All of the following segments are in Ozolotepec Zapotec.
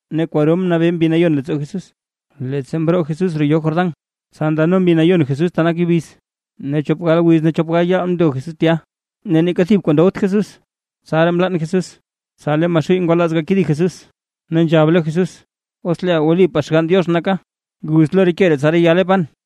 Ne kwaro mnabee Mbi Nayon leettsoo Jesús, leettsa mroo Jesús roo yoo Jordán, tsa ndano Mbi Nayon Jesús ta nak yubiz. Ne chop gal wiz ne chop gal yaal mndo Jesús tya, ne neeka thib kwaa ndowt Jesús, tsaraa mlann Jesús. Tsa lee Maxuuy ngwalaaz gakedi Jesús, ne nzhab lo Jesús: ―Os leeʼa wlipaa Xgann Diox naka, guz lo ke ree tsa reyale pan.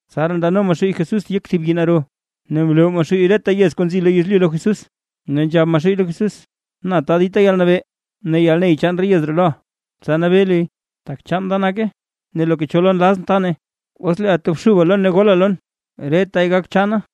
Tsaraa ndano Maxuuy Jesús yek thib yii naro, ne mloo Maxuuy reta yez kuu nzi lo yezlyu lo Jesús. Ne nzhab Maxuuy lo Jesús: ―Na ta dita yalnabee ne yalney chaan re yez ree loʼa, tsa nabee luy, tak chaan da nake, ne loka cho lo nlazʼn ta nay. Os leeʼa tobxuba lon ne gola lon, retay gak chaana.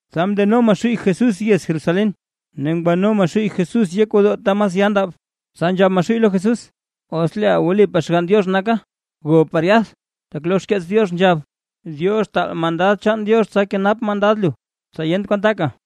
Tsa mndeno Maxuuy Jesús yez Jerusalén, ne ngwano Maxuuy Jesús yek gwodoo ta mas ya ndab, tsa nzhab Maxuuy lo Jesús: ―Os leeʼa wlipaa Xgann Diox naka, gob par yath, tak lo xkeets Diox nzhab: Diox taal mandad chaan Diox tsa kenap mandad lu, tsa yent kwan taka,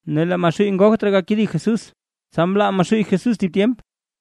Ne lee Maxuuy ngogt raa gakedi Jesús, tsa mlaa Maxuuy Jesús thib tyemp.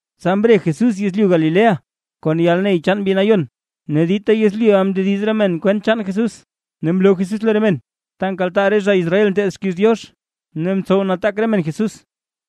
Tsa mre Jesús yezlyu Galilea kon yalney chaan Mbi Nayon, ne dita yezlyuʼa mndediz re men kwent chaan Jesús. Ne mloo Jesús lo re men ta nkaltaa re zha Israel nteed xkiiz Diox, ne ntsow nataak re men Jesús.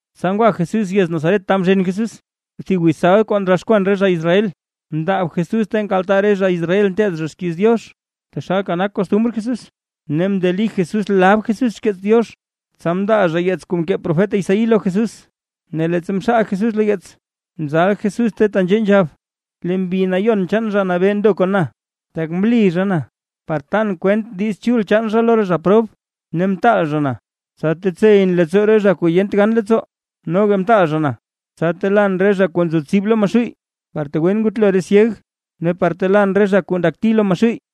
Tsa ngwa Jesús yez Nazaret ta mzhen Jesús. Thib wiz sabd kuu ndroxkwan re zha Israel, mndaab Jesús ta nkaltaa re zha Israel nteed zha xkiiz Diox, taxalka nak kostumr Jesús, ne mndeli Jesús lab Jesús xkeets Diox. Tsa mndaa zha yeets kuu mkee profet Isaí lo Jesús. Ne leettsa mxaal Jesús lo yeets, mzal Jesús ta tenzhee nzhab: Lee Mbi Nayon chaan Zha Nabee ndo kon na, tak mli zha na par tan kwent Diiz Chul chaan zha lo re zha prob, ne mtaal zha na, tsa tetseyʼn leettsoo re zha kuu yent gan leettsoo, noga mtaal zha na, tsa telaan re zha kuu nzo tsib lo Maxuuy, par tegwen ngutlo re syeg; ne par telaan re zha kuu ndakti lo Maxuuy;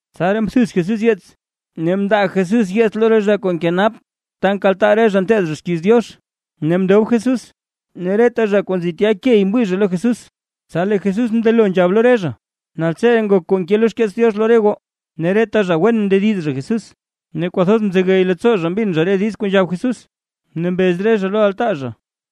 Tsaraa mthuz Jesús yeets, ne mndaa Jesús yeets lo zha kuu nkenap ta nkaltaa re zha nteed xkiiz Diox, ne mndob Jesús. Ne reta zha kuu nzi tya key mwii zha lo Jesús. Tsa lee Jesús mndelo nzhab lo re zha: ―Naltseree ngok kuu nke lo xkeets Diox lo re goo. Ne reta zha wen mndediz zha Jesús, ne kwathoz mzegey leettsoo zha mbin zha re diiz kuu nzhab Jesús, ne mbez re zha lo altaa zha: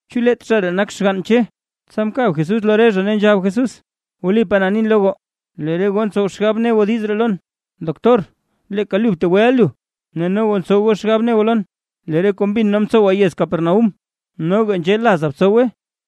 ―¿Chu leet zha ree nak xgann Che? Tsa mkab Jesús lo re zha, ne nzhab Jesús: ―Wlipaa na nin lo goo, lee re goo ntsow goo xgab ne goo diiz ree lon: “Doctor leeka lu btegweʼa lu”. Ne noga ntsow goo xgab ne goo lon: “Lee re kuu mbin nee mtsowa yez Capernaúm, noga nzhee laza btsowe”.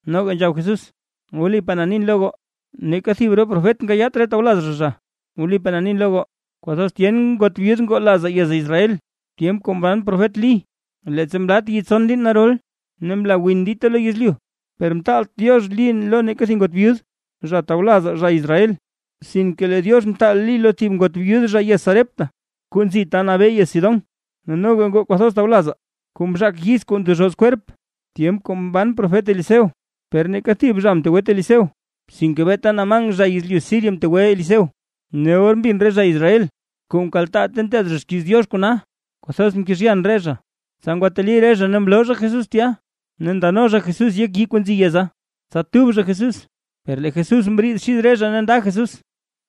Noga nzhab Jesús: ―Wlipaa na nin lo goo, neeka thib re profet nkayaat re tawlaz zha zha. Wlipaa na nin lo goo, kwathoz tyen ngot byud ngoo lazaa yez Israel, tyemp kuu mban profet Lí, leettsa mlat yi tson liin narol, ne mla win dita lo yezlyu. Per mtaalt Diox Lí lo neeka thib ngot byud zha tawlazaa zha Israel, sinke lee Diox mtaal Lí lo thib ngot byud zha yez Sarepta, kuu nzi ta nabee yez Sidón. Ne noga ngoo kwathoz tawlazaa kuu mzhaak yiz kuu ndezhoz kwerp zha, tyemp kuu mban profet Eliseo, per neeka thib zha mtegwet Eliseo, sinke beeta Naamán zha yezlyu Siria mtegwe Eliseo. Ne or mbin re zha Israel kuu mkaltaa ta nteed zha xkiiz Diox kona, kwathoz mkezhyan re zha. Tsa ngwateli re zha ne mloo zha Jesús tya, ne ndano zha Jesús yek yii kuu nzi yeza, tsa tub zha Jesús. Per lee Jesús mriid xid re zha ne nda Jesús.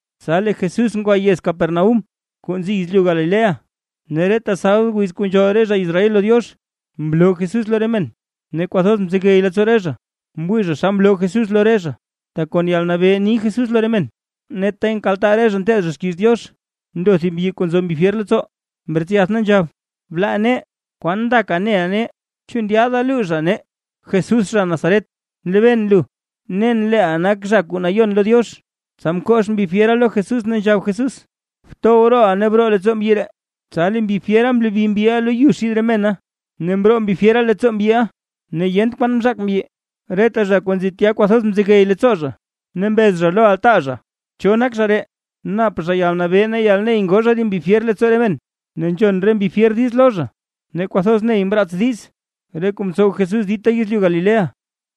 Tsa lee Jesús ngwa yez Capernaúm, kuu nzi yezlyu Galilea. Ne reta sabd wiz kuu nzhool re zha Israel lo Diox, mloo Jesús lo re men. Ne kwathoz mzegey leettsoo re zha, mwii zha xa mloo Jesús lo re zha, tak kon yalnabee ni Jesús lo re men. Ne ta nkaltaa re zha nteed zha xkiiz Diox, ndo thib mbyi kuu nzo mbi fyer leettsoo, mretsyath ne nzhab: ―¡Blaa nee! ¿Kwan ndaka neʼa nee? ¿Chu ndyaada luuzha nee Jesús zha Nazaret? Nlebeen lu, nen leeʼa nak Zha Kuu Nayon lo Diox. Tsa mkox mbi fyera lo Jesús, ne nzhab Jesús: ―¡Btow rooʼa ne broo leettsoo mbyi ree! Tsa lee mbi fyera mlobi mbyiʼa lo yu xid re mena, ne mroo mbi fyera leettsoo mbyiʼa, ne yent kwan mzhaak mbyi. Reta zha kuu nzi tya kwathoz mzegey leettsoo zha, ne mbez zha lo altaa zha: ―¿Cho nak zha ree? Nap zha yalnabee ne yalney ngoo zha re mbi fyer leettsoo re men, ne nzhon re mbi fyer diiz lo zha. Ne kwathoz ney mraats diiz, re kuu mtsow Jesús dita yezlyu Galilea.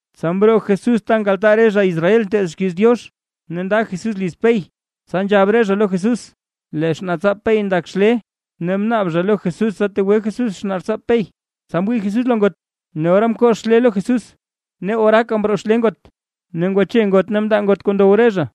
Tsa mroo Jesús ta nkaltaa re zha Israel nteed xkiiz Diox, ne nda Jesús liz Pey, tsa nzhab re zha lo Jesús lee xnaatsaap Pey ndak xlee, ne mnaab zha lo Jesús tsa tegwe Jesús xnaatsaap Pey. Tsa mwii Jesús lo ngot, ne ora mkox xlee lo Jesús, ne oraaka mroo xlee ngot. Ne ngwache ngot ne mndaa ngot kuu ndow re zha.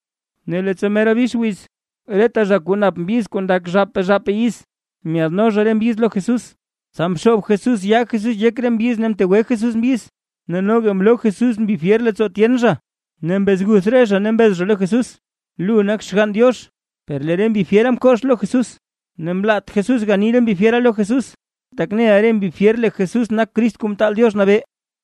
Ne leettsa mera bix wiz, reta zha kuu nap mbyiz kuu ndak zhaapaa zhaapaa yiz, myaadno zha re mbyiz lo Jesús, tsa mxoob Jesús yaa Jesús yek re mbyiz ne mtegwe Jesús mbyiz. Ne noga mloo Jesús mbi fyer leettsoo tyen zha, ne mbezguth re zha ne mbez zha lo Jesús: ―¡Lu nak Xgann Diox! Per lee re mbi fyera mkox lo Jesús, ne mlaat Jesús gani re mbi fyera lo Jesús, tak neʼa re mbi fyer lee Jesús nak Crist Kuu Mtaal Diox Nabee.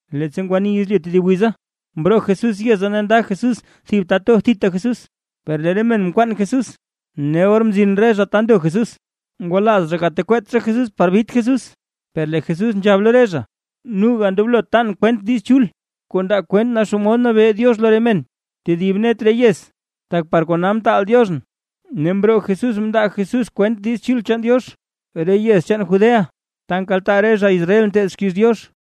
Leettsa ngwani yezlyu tedib wiza, mroo Jesús yeza ne nda Jesús thib ta to thita Jesús. Per lee re men mkwaan Jesús, ne or mzin re zha ta ndo Jesús. Ngwalaaz zha gatekweet zha Jesús par bit Jesús. Per lee Jesús nzhab lo re zha: ―Noga ndoblo tan kwent Diiz Chul kuu ndaa kwent xomod nabee Diox lo re men tedib net re yez, tak par kona mtaal Dioxʼn. Ne mroo Jesús mndaa Jesús kwent Diiz Chul chaan Diox, re yez chaan Judea, ta nkaltaa re zha Israel nteed xkiiz Diox.